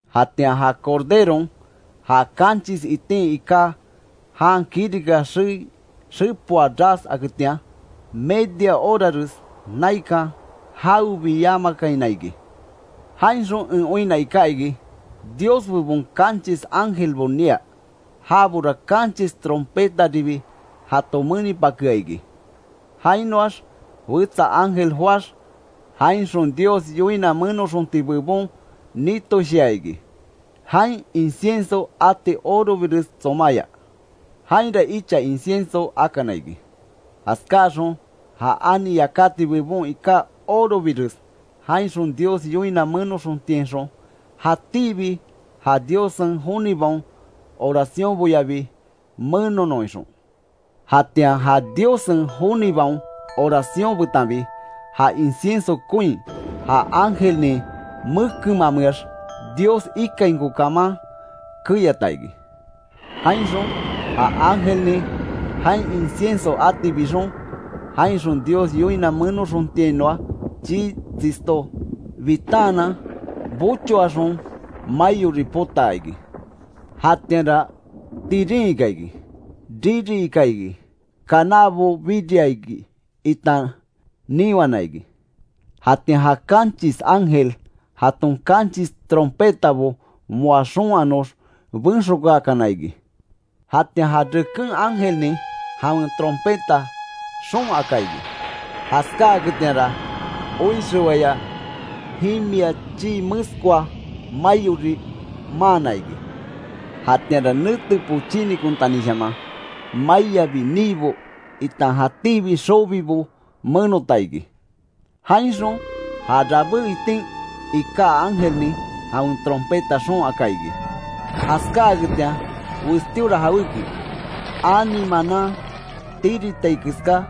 Jatian ja Corderon, ja kanchis itin iká, jan kirika xei xepoa ras aketian, media orares naikan jawebi yamakaina iki. Jainxon en oinna iká iki, Dios bebon kanchis ángelbo nia. Jabora kanchis trompetaribi jato menipakea iki. Jainoax wetsa ángel joáx, jainxon Dios yoina menoxonti bebon nitoshia iki, jain incienso ati orobires tsomáya. Jainra icha incienso akana iki, jaskáaxon ja ani yakati bebon iká orobires jainxon Dios yoina menoxontiainxon, jatíbi ja Diossen jonibaon oraciónboyabi menonon ixon. Jatian ja Diossen jonibaon oracion betanbi, ja incienso koin, ja ángelnin mekenmameax Dios ikainko kaman keyata iki. Jainxon ja ángelnin, jain incienso ati bixon, jainxon Dios yoina menoxontiainoa chii tsisto bitaanan bochoaxon maiori potaa iki. Jatianra tirin ika iki, riri ika iki, kanábo biria iki itan niwana iki. Jatian ja kanchis ángel, jaton kanchis trompetabo moa xoon anox benxokáakana iki. Jatian ja reken ángelnin jawen trompeta xoon aka iki. Jaskáketianra, oixewaya jimia chii meskoa, maiori maana iki. Jatianra nete pochínikontanishaman maiabi, niibo, itan jatíbi xobibo menota iki. Jainxon ja rabé itin iká ángelnin jawen trompeta xoon aka iki. Jaskáaketian westíora jawéki, ani manan tiritai keská,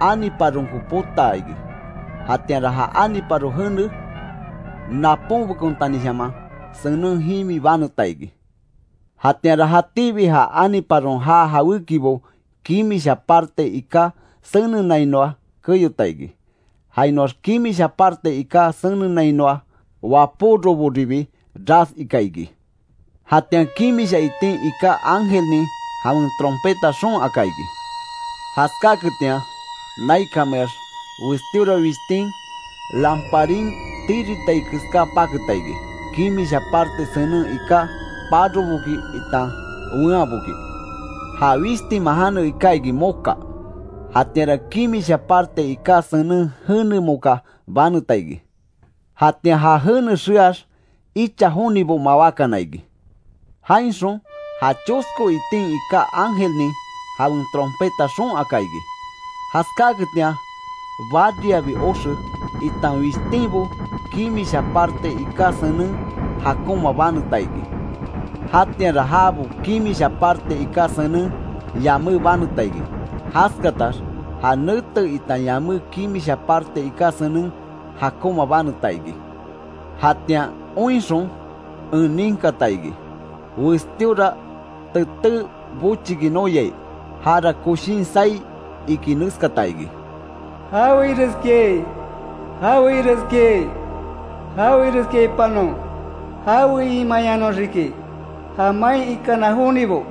aniparonko potaa iki. Jatianra ja aniparo jene, naponbekontanishaman senen jimi baneta iki. Jatianra jatíbi ja aniparon jaa jawékibo kimisha parte iká senenainoa keyota iki. Jainoax kimisha parte iká senenainoa wapóroboribi ras ika iki. Jatian kimisha itin iká ángelnin jawen trompeta xoon aka iki. Jaskáketian naikanmeax westíora wishtin lamparin tiritai keská paketa iki, kimisha parte senen iká paroboki itan weanboki. Ja wishtinman jane iká iki Moka. Jatianra kimisha parte iká senen jene moka baneta iki. Jatian ja jene xeaax, icha jonibo mawákana iki. Jainxon ja chosko itin iká ángelnin, jawen trompeta xoon aka iki. Jaskaketian bariyabi oxe, itan wishtinbo kimisha parte iká senen jakonma baneta iki. Jatianra jabo kimisha parte iká senen, yamé baneta iki. Jaskatax ja nete itan yamé kimisha parte iká senen, jakoma baneta iki. Jatian oinxon en ninkata iki, westíora teté bochiki noyai. Jara koshín saí iki neskata iki: “¡Jawe ireskiai, jawe ireskiai. Jawe ireskiaipanon, jawe imeyanoxiki ja main ikana jonibo,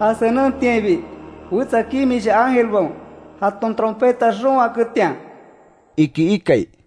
ja senentiainbi wetsa kimisha ángelbaon jaton trompeta xoon aketian!” iki ikai.